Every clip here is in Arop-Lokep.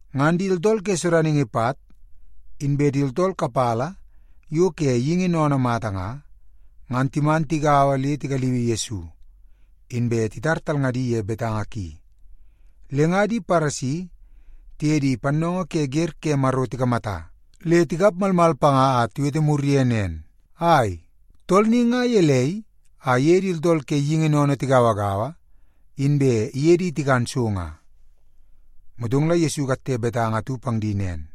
Ngan di tooltool ke sodaningi pat, inbe di tooltool kapala yo ke geingi sennene mata nga, ngan timan tigaua le tigaliui Yesu, inbe titar talngadi ye betanga ki. Le nga di Paresi tiye di pannoongoo ke wer ke Maro tikamata le tikap malmal panga a tiwete mur ye nen, “Ai, tool ni nga gelei a iye di tooltool ke geingi sennene tigauagaua, inbe iye di tikan so nga?” Motong la Yesu ikatte betanga atu pang di nen,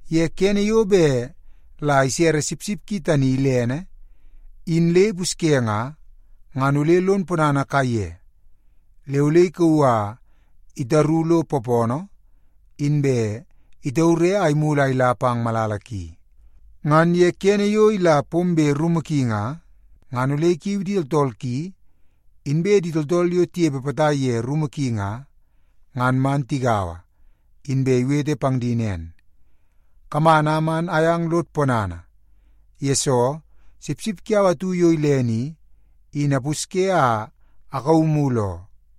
Ye kene yo bet la isere sipsip ki tani ilene in le ipusye nga, ngan ole lon ponana kaiye le ole ikauu a itaru lo poopoonoo, inbe itaure a imulu a ila pang malala ki. Ngan ye kene yo ila pombe rumu ki nga, ngan ole ikiu di tooltool ki, inbe di tooltool yo tinepe potai ye rumu ki nga, ngan man tigaua, inbe iwete pang di nen, ‘Kaman a man ayang lod ponana, yesoo sipsip kiau atu yo ilene i, in apusye a akauu mulu oo.’”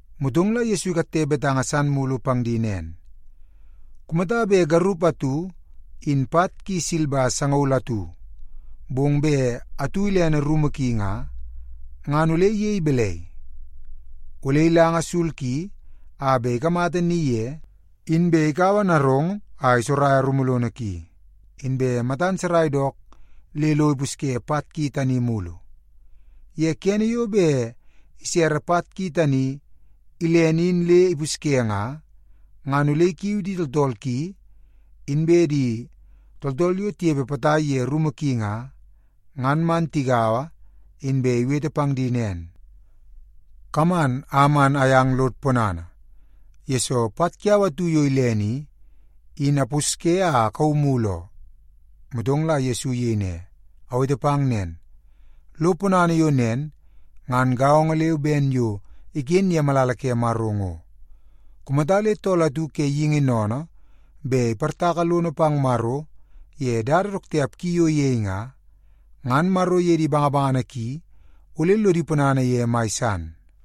Motong la Yesu ikatte betanga san mulu pang di nen, “Kumata bet garup atu in pat ki silba sangaul atu, bong bet atu ilene rumu ki nga, ngan ole iyei balai? Ole ilanga sul ki a bet ikamata ni ye, inbe ikaua narong a isoraia rumu lono ki, inbe matan sarai dook le lo ipusye pat ki tani mulu. Ye kene yo bet isere pat ki tani ilene in le ipusye nga, ngan ole ikiu di tooltool ki, inbe di tooltool yo tinepe potai ye rumu ki nga, ngan man tigaua, inbe iwete pang di nen, ‘Kaman a man ayang lod ponana, yesoo pat kiau atu yo ilene i, in apusye a akauu mulu oo.’” Motong la Yesu iyei ne, “Awete pang nen, lo ponana yo nen ngan gaongo leu ben yo iken ye malala ke Maro ngo. Kumata le tool atu ke geingi sennene bet iportaka lono pang Maro ye dada dook tiap ki yo iyei nga, ngan Maro iye di bangabangana ki ole lodi ponana ye mai san.”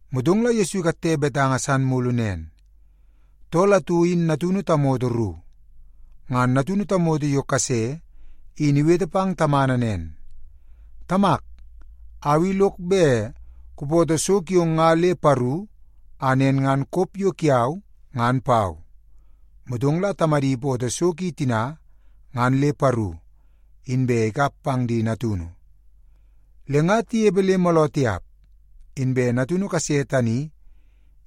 Motong la Yesu ikatte betanga san mulu nen, “Tool atu in natunu tamoto ru. Ngan natunu tamoto yo kase in iwete pang tamana nen, ‘Tamak, au i lok bet kupoto so kiong nga le paru a nen ngan kop yo kiau ngan pau.’ Motong la tamadi ipoto so ki tina ngan le paru, inbe ikap pang di natunu. “Le nga tinepe le mooloo tiap, inbe natunu kase tani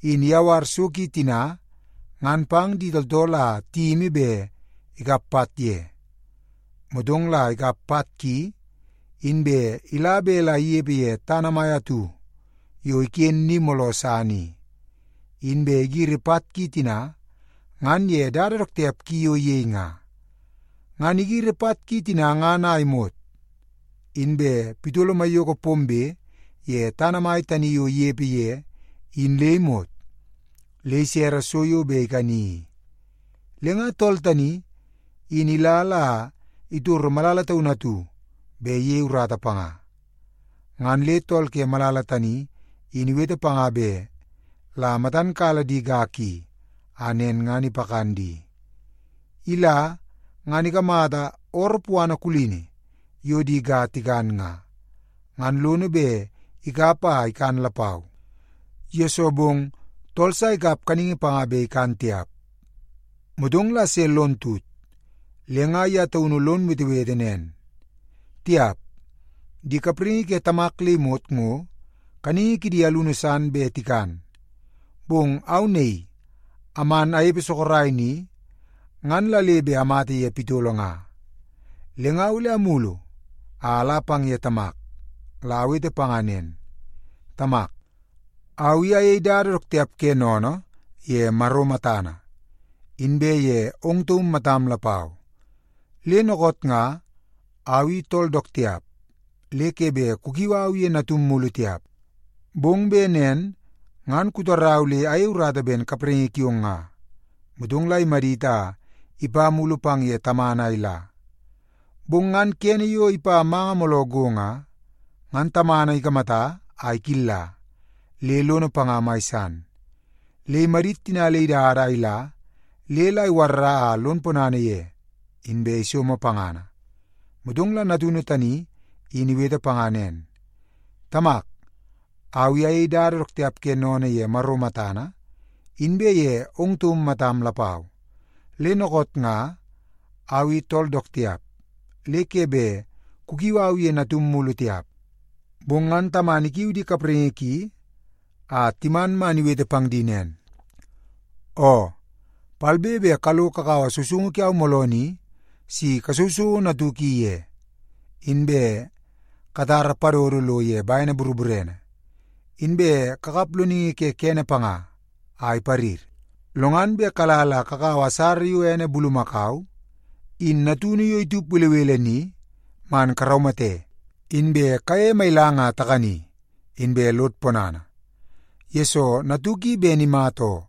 in iyawar so ki tina ngan pang di tooltool a tiyimi bet ikap pat ye. Motong la ikap pat ki, inbe ila bet la inepe ye tana mai atu yo iken ni mooloo san i. Inbe igiri pat ki tina ngan ye dada dook tiap ki yo iyei nga. Ngan igiri pat ki tina ngan a imot, inbe pitolo maiyoko pombe ye tana mai tani yo inepe ye in le imot, le isere so yo bet ikani i. Le nga tool tani in ila la itoro malala taunu atu bet iyei urata panga. Ngan le tool ke malala tani in iwete panga bet la matan kala di ga ki, a nen ngan ipakan di. Ila, ngan ikamata ooroo puana kulini yo di ga tikan nga, ngan lono bet ikap a ikan lapau, yesoo bong tool sa ikap kaningi panga bet ikan tiap. “Motong la se lon tut, le nga ye taunu lon wetewete nen, ‘Tiap, di kapraingi ke tamak le imot ngo kaningi kidi alunu san bet tikan, bong au naii aman anepe sorok ni, ngan la le bet amata ye pitolo nga! Le nga, ole amulu a ala pang ye tamak, la awete panga nen, “Tamak, au i ayei dada dook tiap ke sennene ye Maro matana, inbe ye ong taum matam lapau. Le dookoot nga, au i tool dook tiap le ke bet kukiu au ye natum mulu tiap, bong bet nen ngan kutarau le ayei urata ben kapraingi kiong nga.” ’ Motong la imadit a ipa mulu pang ye tamana a ila. “Bong ngan kene yo ipa manga mooloo go nga, ngan tamana ikamata a ikilla, le lono panga mai san. Le imadit tina le idada a ila le la iwarra a lon ponana ye, inbe isomo pangana. “Motong la natunu tani in iwete panga nen, ‘Tamak, au i ayei dada dook tiap ke sennene ye Maro matana inbe ye ong taum matam lapau. Le dookoot nga, au i tool dook tiap le ke bet kukiu au ye natum mulu tiap.’ “Bong ngan tamana ikiu di kapraingi ki a timan man iwete pang di nen, ‘Oo, palbe be kalo kakaua sousoungu kiau mooloo ni si kasousouo natuk i ye, inbe katara padodo lo ye bene boroborene, inbe kakap loningi ke kede panga a iparir. Lo ngan bet kala la kakaua asara yo ene bulumakau in natunu yo itup belebele ni, man karaumate, inbe kayeie mailang a takani, inbe lod ponana, yesoo natuk i ben imata oo,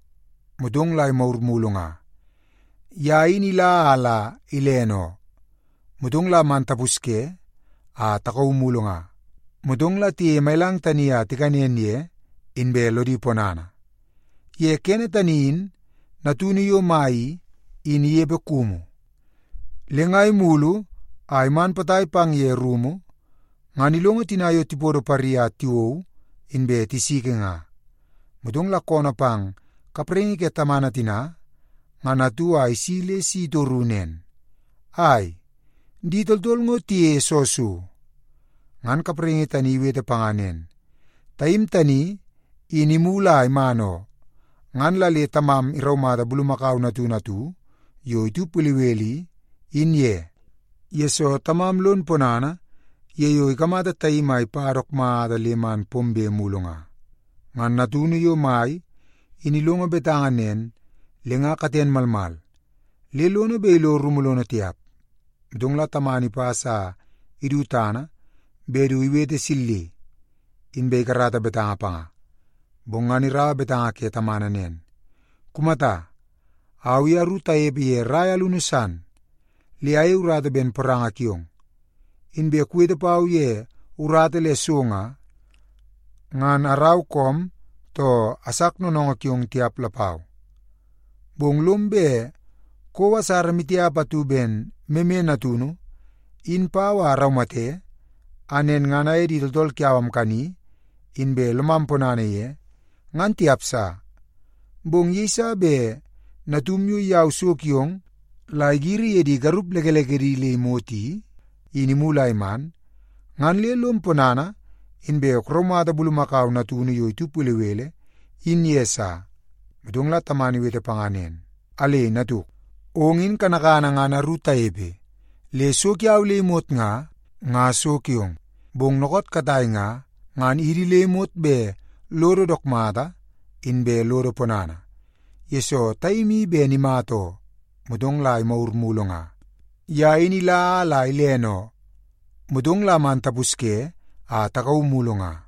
motong la imagur mulu nga. Ye in ila a la ilene oo, motong la man tapusye a takauu mulu nga.’ Motong la tiyeie mailang tani a tikanen ye, inbe lodi ponana. “Ye kene tani in natunu yo mai i, in inepe kumu. Le nga imulu a iman potai pang ye rumu, ngan ilongo tina yo tipodo pari a tiwou, inbe tisiki nga. Motong la koonoo pang kapraingi ke tamana tina ngan atu a isi le si itoru nen, ‘Ai, di tooltool ngo tiyeie soo so?’ “Ngan kapraingi tani iwete panga nen, ‘Taim tani in imulu a iman oo, ngan la le tamam iraumata bulumakau natunu atu yo itup belebele i, in ye, yesoo tamam lon ponana ye yo ikamata taim ipa dook mata le man pombe mulu nga.’ “Ngan natunu yo mai in ilongo betanga nen, le nga katen malmal le lono bet ilo rumu lono tiap. Motong la tamana ipas a idu tana bet du iwete silli, inbe ikarata betanga panga. Bong ngan iraua betanga ke tamana nen, ‘Kumata, au i aru tanepe ye rai alunu san, le ayei urata ben poranga kiong. Inbe kuwete pau ye urata le so nga, ngan arau koom, too asak noonoongoo kiong tiap lapau. Bong lom bet kouo asara maitiap atu ben meme natunu in pau a araumate, a nen ngan aye di tooltool kiau amkani, inbe lomam ponana ye, ngan tiap sa. Bong yeiso bet natum yo iyau so kiong la igiri ye di garup lekelekedi le imot i, in imulu a iman, ngan le lom ponana, inbe kuraumata bulumakau natunu yo itup belebele in ye sa.’ “Motong la tamana iwete panga nen, ‘Alei, natuk! Ong in kanakana ngan aru tanepe le so kiau le imot nga, nga so kiong. Bong dookoot katai nga, ngan idi le imot bet lodo dook mata inbe lodo ponana, yesoo taim i ben imata oo, motong la imagur mulu nga. Ye in ila a la ilene oo, motong la man tapusye a takauu mulu nga.’”